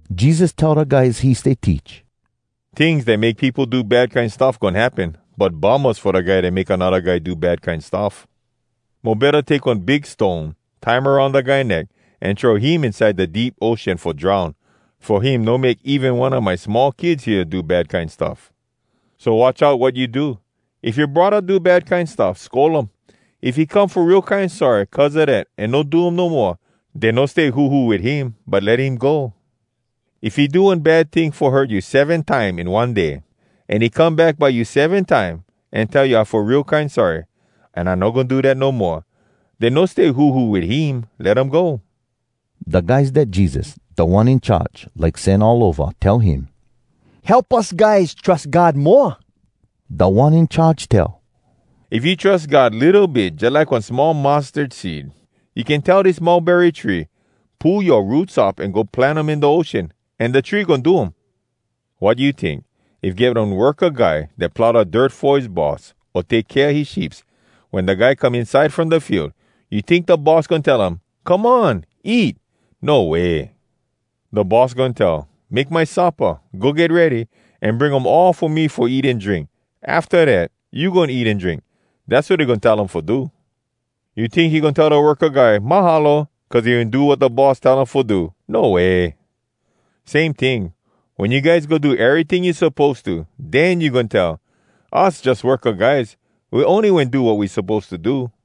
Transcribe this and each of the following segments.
Jesus tell da guys he stay teach, “Tings dat make peopo do bad kine stuff goin happen, but bummahs fo da guy dat make anodda guy do bad kine stuff! Mo betta take one big stone, tie um aroun da guy neck, an throw him inside da deep ocean fo drown, fo him no make even one a my small kids hea do bad kine stuff. So watch out wat you do! “If yoa braddah do bad kine stuff, scold um. If he come fo real kine sorry cuz a dat an no do um no moa, den no stay huhu wit him, but let him go. If he do one bad ting fo hurt you seven time in one day, an he come back by you seven time, an tell, ‘I fo real kine sorry, an I no goin do dat no moa,’ den no stay huhu wit him. Let um go.” Da guys dat Jesus, Da One In Charge, like sen all ova tell him, “Help us guys trus God moa.” Da One In Charge tell, “If you trus God litto bit jalike one small mustard seed, you can tell dis mulberry tree, ‘Pull yoa roots up an go plant um in da ocean,’ an da tree goin do um.” “Wat you tink? If get one worka guy dat plow da dirt fo his boss, o take kea his sheeps, wen da guy come inside from da field, you tink da boss goin tell um, ‘Come on! Eat’? No way! Da boss goin tell, ‘Make my suppa, go get ready, an bring um all fo me fo me eat an drink. Afta dat, you goin eat an drink.’ Dass wat he goin tell um fo do. You tink he goin tell da worka guy ‘Mahalo!’ cuz he wen do wat da boss tell um fo do? No way! Same ting. Wen you guys go do eryting you suppose to, den you goin tell, ‘Us jus worka guys. We ony wen do wat we suppose to do.’”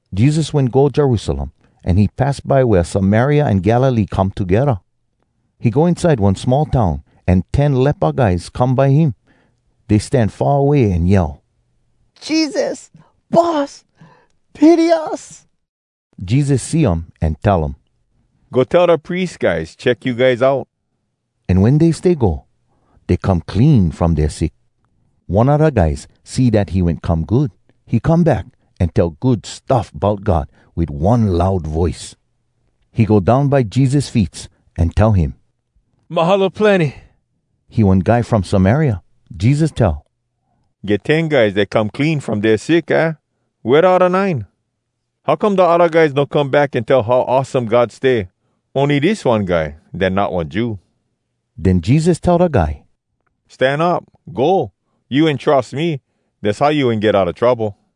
Jesus wen go Jerusalem, an he pass by wea Samaria an Galilee come togedda. He go inside one small town, an ten lepa guys come by him. Dey stan far away an yell, “Jesus, Boss, pity us!” Jesus see um an tell um, “Go tell da pries guys check you guys out.” An wen dey stay go, dey come clean from dea sick. One a da guys see dat he wen come good. He come back, an tell good stuff bout God wit one loud voice. He go down by Jesus feets, an tell him “Mahalo plenny!” He one guy from Samaria. Jesus tell, “Get ten guys dat come clean from dea sick, aah? Wea da odda nine? How come da odda guys no come back an tell how awesome God stay, ony dis one guy dat not one Jew?” Den Jesus tell da guy, “Stan up! Go! You wen trus me, dass how you wen get outa trouble.”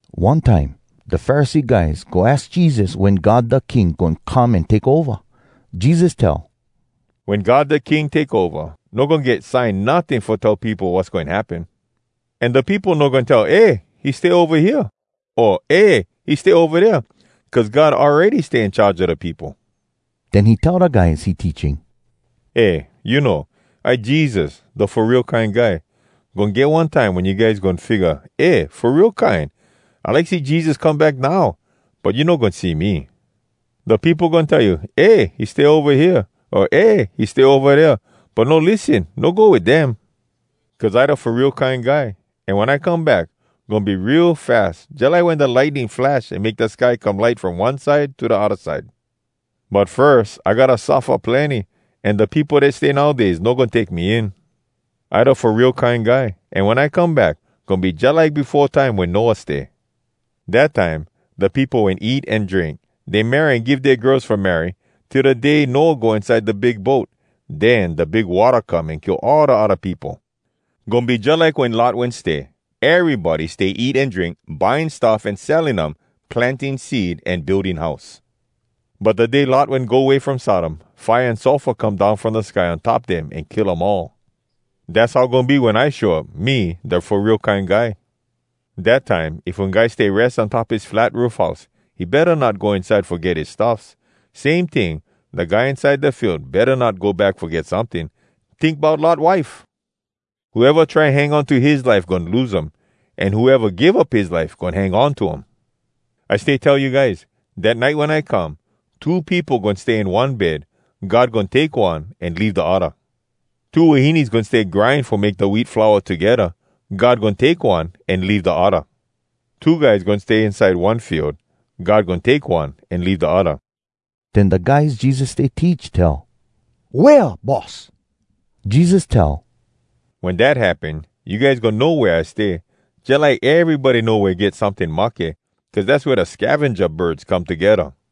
One time, da Pharisee guys go aks Jesus wen God da King goin come an take ova. Jesus tell, “Wen God da King take ova, no goin get sign notting fo tell peopo wass goin happen. An da peopo no goin tell, ‘Eh! He stay ova hea!’ o ‘Eh! He stay ova dea!’ Cuz God awready stay in charge a da peopo.” Den he tell da guys he teaching, “Eh, you know, I Jesus, da Fo Real Kine Guy. Goin get one time, wen you guys goin figga, ‘Eh! Fo real kine, I like see Jesus come back now!’ But you no goin see me. Da peopo goin tell you, ‘Eh! He stay ova hea!’ o ‘Eh! He stay ova dea!’ But no lissen, no go wit dem. Cuz I da Fo Real Kine Guy, an wen I come back, goin be real fas, jalike wen da lightning flash an make da sky come light from one side to da odda side. But firs I gotta suffa plenny, an da peopo dat stay nowdays no goin take me in. “I da Fo Real Kine Guy, an wen I come back, goin be jalike befo time wen Noah stay. Dat time da peopo wen eat an drink, dey marry an give dea girls fo marry, till da day Noah go inside da big boat. Den da big watta come an kill all da odda peopo. Goin be jalike wen Lot wen stay. Erybody stay eat an drink, buying stuff an selling um, planting seed, an building house. But da day Lot wen go way from Sodom, fire an sulfur come down from da sky on top dem an kill um all. Dass how goin be wen I show up, me, da Fo Real Kine Guy. “Dat time if one guy stay res on top his flat roof house, he betta not go inside fo get his stuffs. Same ting, da guy inside da field betta not go back fo get someting. Tink bout Lot wife! Whoeva try hang on to his life goin lose um. An whoeva give up his life goin hang on to um. I stay tell you guys, dat nite wen I come, two peopo goin stay in one bed. God goin take one, an leave da odda. Two wahines goin stay grind fo make da wheat flour togedda. God goin take one, an leave da odda. [Two guys goin stay inside one field. God goin take one, an leave da odda.]” Den da guys Jesus stay teach tell, “Wea, Boss?” Jesus tell, “Wen dat happen, you guys goin know wea I stay. Jalike erybody know wea get someting mahke, cuz dass wea da scavenja birds come togedda.”